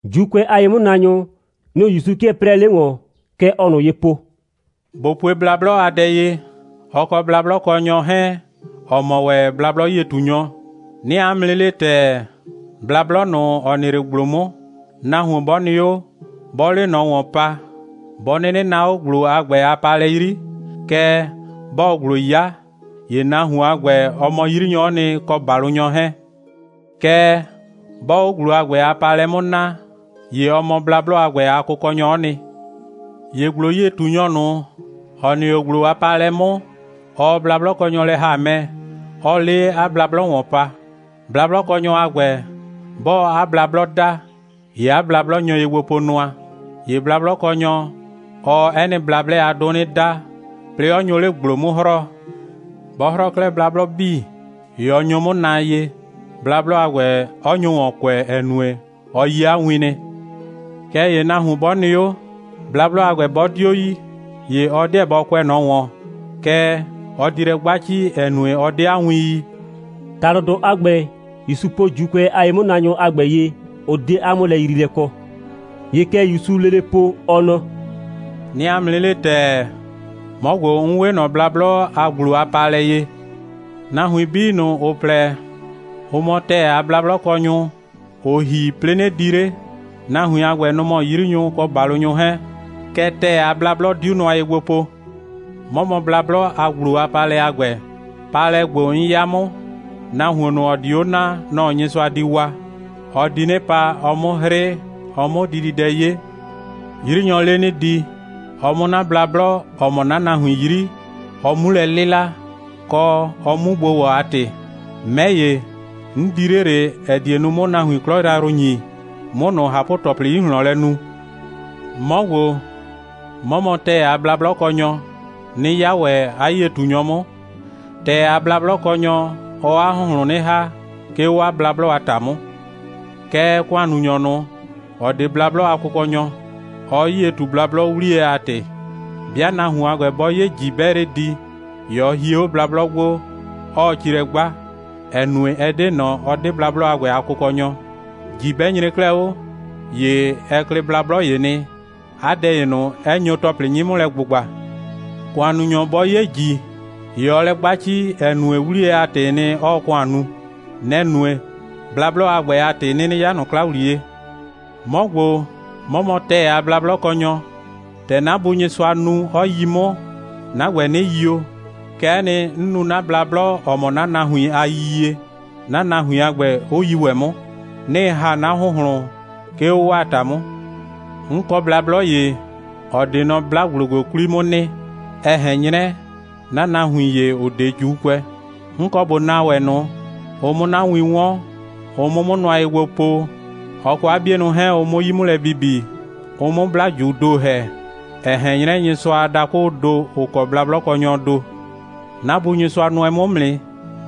(‑Juukʋɛ a ye'mʋnaanyʋ, nʋ‑ ‑Yusu 'kɩɛ 'prɛɛ 'le ‑wɔn.) Kɛ ɔɔ ꞊nʋ ye po: «꞊Bo pue blablɔ a dɛ ye, ɔ kɔ blablɔkɔnyɔ 'hɛɛn, ‑ɔ mɔ ‑wɛ blablɔ'yie꞊tunyɔ. 'Nɩɩ 'a mʋ 'nɩ le ‑tɛɛ, blablɔ ꞊nʋ, ‑ɔ nɩ 'le ‑gblo 'mʋ, nahuon 'bɔ nɩ 'o, 'bɔɔ 'le ꞊nɔ ‑wɔn pa, 'bɔ 'nɩnɩ naa 'o ‑gblo a ‑gbɛ a paalɛ 'yri, kɛɛ, 'bɔɔ ‑gblo 'ya, ‑ye nahuon a ‑gbɛ, ɔ mɔ 'yrinyɔ'ɔ nɩ, kɔ ‑balʋnyɔ 'hɛɛn. Kɛɛ, 'bɔɔ 'o ‑gblo a ‑gbɛ a paalɛ 'mʋ naa, ‑ye ɔ mɔ blablɔ a ‑gbɛ a kʋkɔnyɔ'ɔ nɩ. ‑Ye ‑gblo'yie꞊tunyɔ ꞊nʋ, ‑ɔ nɩ 'o ‑gblo a paalɛ 'mʋ, ɔɔ blablɔkɔnyɔ lɛ ‑ha mɛ, 'ɔɔ 'le 'a blablɔ ‑wɔn pa. Blablɔkɔnyɔ a ‑gbɛ, 'bɔɔ 'a blablɔ da, ‑ye 'a blablɔ nyo ye gbo po nʋa. ‑Ye blablɔkɔnyɔ, ɔɔ 'ɛ nɩ blablɛ a 'dʋ 'nɩ da, 'plɩɩ 'ɔ nyo 'le ‑gblo 'mʋ 'hrɔɔ. 'Bɔ 'hrɔɔ 'klɛɛ 'a blablɔ 'bii, ‑ye ɔ nyo 'mʋ naa ye, blablɔ a ‑gbɛ 'ɔ nyo ‑wɔn kʋɛ, ‑ɛ nue, ɔ yi 'a win nɩ. Kɛɛ ‑ye nahuon 'bɔ nɩ 'o, blablɔ a ‑gbɛ 'bɔ 'dio yi, ‑ye ɔ 'deɛ bɔ kʋɛ ꞊nɔ ‑wɔn, kɛɛ, ɔ di lɛ 'gba ci, ‑ɛ nue, ɔ 'de 'a win yi.» ‑Talʋdʋ a ‑gbɛ, ‑Yusu po ‑Juukʋɛ a ye'mʋnaanyʋ a ‑gbɛ ye, ʋ 'de 'a 'mʋlɛyriilɛ kɔ. ‑Ye kɛ ‑Yusuu lele po, ɔ nɔ: «'Nɩɩ 'a mʋ 'nɩ le ‑tɛɛ, 'mɔ ‑gbo, 'n 'we ꞊nɔ blablɔ a ‑gblo a paalɛ ye. Nahuin 'bii ꞊nʋ, ‑ʋ plɛ, ‑ʋ mɔ ‑tɛɛ a blablɔkɔnyʋ, ‑ʋ ‑hi, 'plɩɩ 'nɩ di 'le, nahuin a ‑gbɛ, nʋ‑ mɔ 'yrinyʋ kɔ ‑balʋnyʋ 'hɛɛn. Kɛɛ, ‑tɛɛ a blablɔ 'diu nʋa ye gbo po. 'Mɔ mɔ blablɔ a ‑gblo a paalɛ a ‑gbɛ. Paalɛ ‑gbo, 'n 'ya 'mʋ, nahuon ꞊nʋ, ‑ɔ di 'o naa, nɔ‑ Nyɩsʋa di waa. Ɔ di 'nɩ pa, ɔ 'mʋ 'hrɩ, ɔ 'mʋ dididɛ 'ye. 'Yrinyɔɔ 'le 'nɩ di, ɔ 'mʋ 'na blablɔ, ‑ɔ mɔ 'na nahuin 'yri, ɔ 'mu lɛ 'lɩla, kɔ, ɔ 'mu gbo ‑wɔ a ‑tɩ. 'Mɛ ‑ye, 'n di 'le ꞊le, ‑ɛ die nu, 'mʋ nahuin 'klɔ yrayrʋ ‑nyi, 'mʋ ꞊nʋ ꞊hapʋ‑tɩ 'plɔplɔ 'yi ꞊hlɔn lɛ nu. 'Mɔ ‑gbo, 'mɔ mɔ ‑tɛɛ a blablɔkɔnyɔ, 'nɩ 'ya ‑wɛ 'a 'yie꞊tunyɔ 'mʋ. ‑Tɛɛ a blablɔkɔnyɔ, ɔɔ 'a ‑hʋnhlʋn 'nɩ ‑ha, 'ke 'o 'a blablɔ a ‑ta 'mʋ. Kɛɛ, ‑kʋannunyɔ ꞊nʋ, ‑ɔ 'de blablɔ a kʋkɔnyɔ, ɔɔ 'yie ꞊tu blablɔ, 'wliyɛ a ‑tɩ. 'Bɩa nahuon a ‑gbɛ 'bɔ 'ye ‑ji, 'bɛɛ 'le di, ‑ye ɔ hie 'o blablɔ gbo, 'ɔɔ ci lɛ 'gba, ‑ɛ nue, ɛ 'de ꞊nɔ, ɔ 'de blablɔ a ‑gbɛ a kʋkɔnyɔ. ‑Ji 'bɛ nyre 'klɛɛ 'o, ‑ye ɛ klɩ blablɔ ‑ye nɩ, 'a dɛ ‑ye ꞊nʋ, 'ɛ nyo ‑tɔplɩ 'nyɩ 'mʋ lɛ ‑gbʋgba. ‑Kʋannunyɔ 'bɔ 'ye ‑ji, ‑ye ɔɔ lɛ 'gba ci, ‑ɛ nue, 'wliyɛ a ‑tɩɩ nɩ, 'ɔɔ ‑kʋan nu. Nɛ‑ nue, blablɔ a ‑gbɛ a ‑tɩ 'ɩ 'nɩnɩ 'yaa ꞊nɔ 'kla ‑wliye. 'Mɔ ‑gbo, 'mɔ mɔ ‑tɛɛ a blablɔkɔnyɔ. ‑Tɛ 'na Bu Nyɩsʋa nu, 'ɔ yi 'mʋ, 'na ‑gbɛ 'nɩ yio, kɛ'ɛ nɩ, 'n nu 'na blablɔ, ‑ɔ mɔ 'na nahuin a yiyie, 'na nahuin a ‑gbɛ, 'ʋ yi ‑wɛ 'mʋ. 'Nɩɩ ‑ha 'na ‑hʋnhlʋn, 'ke 'o 'waa ‑ta 'mʋ. 'N kɔ blablɔ ‑ye, ‑ɔ 'de nɔ 'bla‑gblo ‑gbo 'kwli 'mʋ nɩ, (ɛ ꞊hɛn 'nyrɛ, 'na nahuin ‑ye, ‑ʋ 'de ‑Juukʋɛ). 'N kɔ ꞊bo naa ‑wɛ ꞊nʋ, ɔ 'mʋ 'na win 'wɔn, ɔ 'mʋ 'mʋ nʋa ye gbo po, ɔ kɔ 'a 'bienʋ 'hɛɛn, ɔ 'mʋ 'yi 'mʋ lɛ bibi, ɔ 'mʋ 'bla꞊juu ‑do ‑hɛ, ‑ɛ ꞊hɛn 'nyrɛ Nyɩsʋa a dakʋʋ ‑do, ‑ʋ kɔ blablɔkɔnyɔɔ ‑do. 'Na Bu Nyɩsʋa nʋɛ 'mʋ 'mʋ nɩ,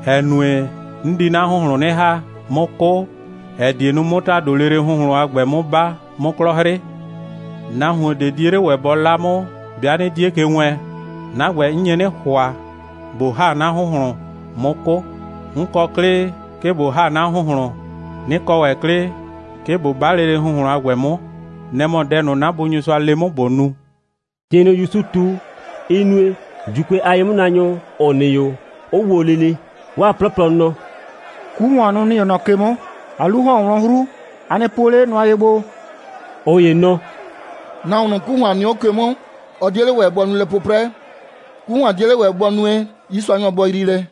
‑ɛ nue, 'n di 'na ‑hʋnhlʋn 'nɩ ‑ha, 'mʋ 'kʋ, ‑ɛ die nu, 'mʋ ‑tado lele ‑hʋnhlʋn a ‑gbɛ 'mʋ 'ba, 'mʋ 'klɔ 'hrɩ. Nahuon ꞊de 'die 'le ‑wɛ bɔ 'la 'mʋ, 'bɩa 'nɩ 'die ke wɛɛn. 'Na ‑gbɛ, 'n nye 'nɩ ‑hʋa, ꞊bo ‑ha 'na ‑hʋnhlʋn, 'mʋ 'kʋ. 'N kɔ 'klɩ, 'ke ꞊bo ‑ha 'na ‑hʋnhlʋn, 'nɩ kɔ ‑wɛ 'klɩ, 'ke ꞊bo 'ba lele ‑hʋnhlʋn a ‑gbɛ 'mʋ. Nɛ‑ mɔ dɛ ꞊nʋ, 'na Bu Nyɩsʋa le 'mʋ, ꞊bo nu.» ‑Tɩ ꞊nʋ ‑Yusu ꞊tu, ɩ nue, ‑Juukʋɛ a ye'mʋnaanyʋ, ‑ʋ nɩ 'o, 'ʋ wo lele. 'Waa 'plɔplɔ nɔ: «'Ku ‑hʋan, nʋ‑ nɩ 'o ꞊nɔ ke 'mʋ. 'A 'lu ‑hɔn 'o wlɔn 'hru. A nɩ puo 'le nʋa ye gbo!» ꞊Ʋ ‑ye nɔ: «Nahuon ꞊nʋ, 'ku ‑hʋan nɩ 'o ke 'mʋ, ɔ 'die 'le ‑wɛ bɔ nu lɛ 'pʋprɛ. 'Ku ‑hʋan 'die 'le ‑wɛ bʋ nue, 'yiisuanyɔ bɔ yrii lɛ.»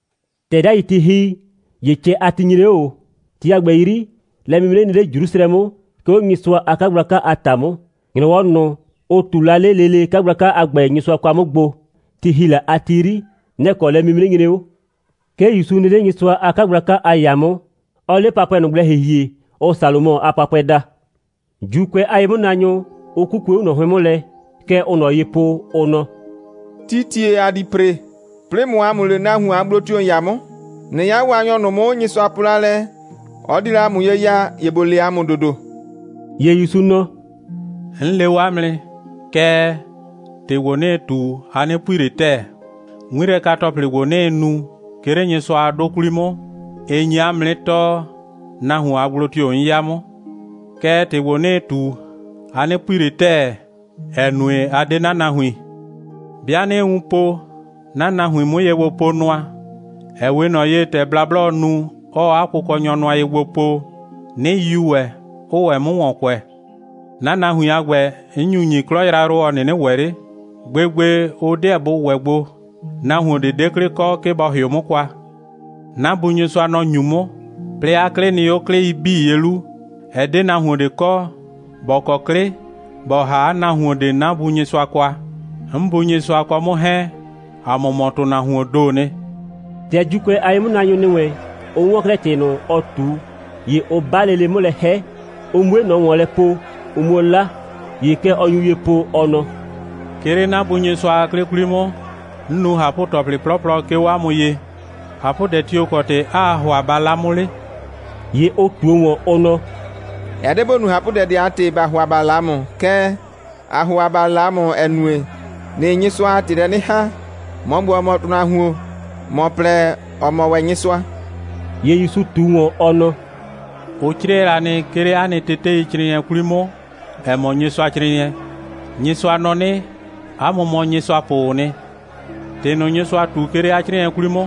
‑Tɛ 'dai ti ‑hi, ‑ye cɛ a ti nyre 'o ꞊o. Ti a ‑gbɛ 'yri, lɛ'mimre nɩ 'le Jrusrɛ 'mʋ, 'ke 'o Nyɩsʋa a 'kagblaka a ‑ta 'mʋ. ‑Nyrɔwɔ ꞊nʋ, ʋ ꞊tu la 'le lele 'kagblaka a ‑gbɛ Nyɩsʋa kwa 'mʋ gbo, ti ‑hi la a ti 'yri, nɛ‑ kɔ lɛ'mreti nyre 'o. 'Ke ‑Yusu nɩ 'le Nyɩsʋa a 'kagblaka a ‑yaa 'mʋ, 'ɔɔ 'le papʋɛ ꞊nʋ gblɛ ‑hihie, ʋʋ Salomɔ a papʋɛ daa; ‑Juukʋɛ a ye'mʋnaanyʋ 'ʋ 'kukue 'o ꞊nɔ 'hʋɩn 'mʋ lɛ. Kɛ ʋʋ ꞊nɔ ye po, ʋ nɔ: «Tii ‑tie ‑a di ‑pre, 'plɩɩ ꞊mʋ ‑a mʋ le, nahuon a gblo tio‑ ‑n 'ya 'mʋ? ꞊Nɩ 'ya Waanyɔ ꞊nʋ 'mʋ, Nyɩsʋa po la lɛ, ɔ di la ‑a mʋ ye ya, ‑ye ‑bo le ‑a mʋ ‑dodo.» ‑Ye ‑Yusu nɔ: «'N le o 'a mʋ nɩ, kɛɛ, ‑tɩ ‑gbo, 'nɩɩ ꞊tu, a 'nɩ pui ꞊le ‑tɛɛ. 'Ŋmilɛka‑tɔplɩ ‑gbo, 'nɩɩ nu, 'ke 'le Nyɩsʋa a 'dʋ 'kwli 'mʋ, ɩ nyi 'a mʋ 'nɩ tɔɔ, nahuon a gblo tio‑ 'n 'ya 'mʋ. Kɛɛ, ‑tɩ ‑gbo, 'nɩɩ ꞊tu, a 'nɩ pui ꞊le ‑tɛɛ, ‑ɛ nue, a 'de 'na nahuin. 'Bɩa 'nɩɩ wun po, 'na nahuiin 'mʋ ye gbo po nʋa, ‑ɛ 'we ꞊nɔ ye, ‑tɛ blablɔɔ nu, 'ɔɔ 'a kʋkɔnyɔ nʋa ye gbo po, 'nɩ yiu ‑wɛ, 'ʋʋ 'mʋ ‑wɔn kʋɛ. 'Na nahuin a ‑gbɛ, 'n nyu ‑nyi 'klɔ yrayrʋ, ‑ɔ 'nɩnɩ ‑wɛ 'le. Gbegbe, ʋ 'deɛ bʋ ‑wɛ gbo. Nahuon ꞊de 'de 'klɩ kɔ, 'ke bɔ ‑hɩʋ 'mʋ kwa. 'Na Bu Nyɩsʋa, nɔ‑ ‑nyu 'mʋ, 'plɩɩ 'a 'klɩ nɩ 'o 'klɩi 'bii ye 'lu. Ɛ 'de nahuon ꞊de kɔ, ‑bɔ kɔ 'klɩ, ‑bɔ ‑ha 'a nahuon ꞊de 'na Bu Nyɩsʋa kwa. 'N Bu Nyɩsʋa kɔ 'mʋ 'hɛɛn, ‑a mʋ mɔ ‑tʋnahuoon ‑doo nɩ.» ‑Tɛ ‑Juukʋɛ a ye'mʋnaanyʋ ‑nɩ wɛn, ʋ 'wɔn 'klɛɛ ‑tɩ ꞊nʋ, ɔ ꞊tu, ‑ye ʋ 'ba lele 'mʋ lɛ 'hɛ, ʋ 'mue ꞊nɔ ‑wɔn lɛ po, ʋ 'muo 'la. ‑Ye kɛ ɔ nyu ye po, ɔ nɔ: «'Ke 'le 'na Bu Nyɩsʋa a 'klɩ 'kwli 'mʋ, 'n nu ꞊hapʋ‑tɔplɩ 'plɔplɔ, 'ke 'o 'a mʋ ye. ꞊Hapʋdɛ tio‑ kɔ ‑tɩ 'aa ‑hʋa ba 'la 'mʋ 'le?» ‑Ye ʋ ꞊tuo ‑wɔn, ʋ nɔ: «Ɛ 'de ‑bo nu ꞊hapʋdɛ ꞊de a ‑tɩ, ‑ba ‑hʋa ‑ba 'la ‑mʋ, kɛɛ, ‑aa ‑hʋa ‑ba 'la ‑mʋ, ‑ɛ nue, ‑nɩɩ Nyɩsʋa a ‑tɩ lɛ 'nɩ ‑haa. ‑Mɔ ‑gbo, ‑ɔ mɔ ‑tʋnahuon, ‑mɔ plɛ, ‑ɔ mɔ ‑wɛ Nyɩsʋa.» ‑Ye ‑Yusu ꞊tu ‑wɔn, ɔ nɔ: «Ʋ 'crɩɛ la nɩ, 'ke 'le 'a nɩ teteicrɩɩnɩɛ 'kwli 'mʋ, ‑ɛ mɔ Nyɩsʋacrɩɩnɩɛ: Nyɩsʋa nɔ 'nɩ: 'A mʋ mɔ nyɩsʋapʋʋ nɩ. ‑Tɩ ꞊nʋ, Nyɩsʋa ꞊tu, 'ke 'le 'a 'crɩɩnɩɛ 'kwli 'mʋ,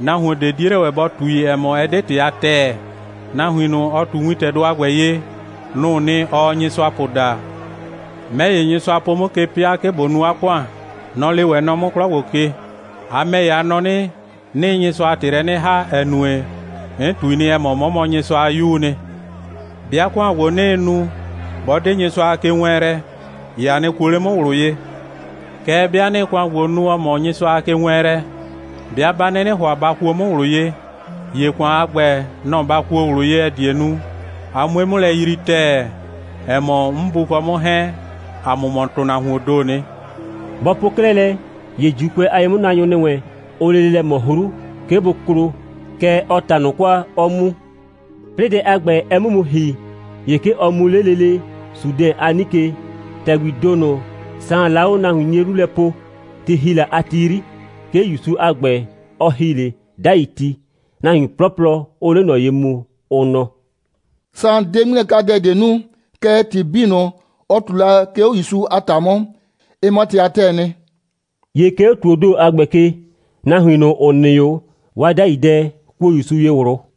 nahuon ꞊de 'die 'le ‑wɛ bɔ ꞊tui, ‑ɛ mɔ, ɩ 'de ‑tɩ a ‑tɛɛ. Nahuin ꞊nʋ, ɔ ꞊tu wintɛdʋ a ‑gbɛ ye, nʋ‑ʋ nɩ, ɔɔ nyɩsʋapʋ daa. 'Mɛ ‑ye, Nyɩsʋa po 'mʋ ke 'pɩa, 'ke ꞊bo nu 'a ‑kʋan. Nɔ‑ lee ‑wɛ nɔ 'mʋ 'klɔ ‑gbo ke. A ‑mɛ ‑ye, a nɔ 'nɩ, 'nɩɩ Nyɩsʋa a ‑tɩ lɛ 'nɩ ‑haa, ‑ɛ nue, 'n ꞊tui nɩ, ‑ɛ mɔ, 'mɔ mɔ Nyɩsʋa a 'Yuu nɩ. 'Bɩa ‑kʋan ‑gbo, 'nɩɩ nu, 'bɔ 'de Nyɩsʋa a kewɛɛnlɛ, ‑ye a nɩ kuo 'le 'mʋ ꞊wlʋ ye. Kɛɛ, 'bɩa 'nɩɩ ‑kʋan ‑gbo nu, ‑ɔ mɔ Nyɩsʋa a kewɛɛnlɛ, 'bɩa 'ba 'nɩnɩ ‑hʋa ba kuo 'mʋ ꞊wlʋ ye, ‑ye ‑kʋan a ‑gbɛ, nɔ‑ ba kuo ꞊wlʋ ye, ‑ɛ die nu, a 'mue 'mʋ lɛ yrii ‑tɛɛ, ‑ɛ mɔ, 'n Bu kɔ 'mʋ 'hɛɛn, ‑a mʋ mɔ ‑tʋnahuoon ‑doo nɩ.» Bɔ po 'klɛɛ lɛ, ‑ye ‑Juukʋɛ a ye'mʋnaanyʋ ‑nɩ wɛn, ʋʋ lele lɛ ꞊mɔ 'hru, 'ke bʋ klo, kɛɛ, ɔ ꞊ta ꞊nʋ kwa, 'ɔ mu. 'Plɩɩ dɛ a ‑gbɛ, ɛ 'mʋ mu ‑hi, ‑ye 'ke ɔ mu 'le lele Sudɛn a 'nike, ‑tɛgbii ‑do ꞊nʋ, Saan la 'o nahuin 'nie 'lu lɛ poo, ti ‑hi la a ti 'yri. 'Ke ‑Yusu a ‑gbɛ, ɔ ‑hi 'le 'dai ti, nahuin 'plɔplɔ 'ʋʋ 'le ꞊nɔ ye mu, ʋ nɔ: «Saan 'de 'ŋmilɛkadɛ ꞊de nu, kɛɛ, ‑tɩ 'bii ꞊nʋ, ɔ ꞊tu la, 'ke 'o ‑Yusu a ‑ta 'mʋ, ɩ mɔ ‑tɩ a ‑tɛɛ nɩ.» ‑Ye 'ke 'o ‑tuoo ‑do a ‑gbɛ ke, nahuin ꞊nʋ, ‑ʋ nɩ 'o, 'waa 'dai dɛ kuo ‑Yusu ye ꞊wlʋ.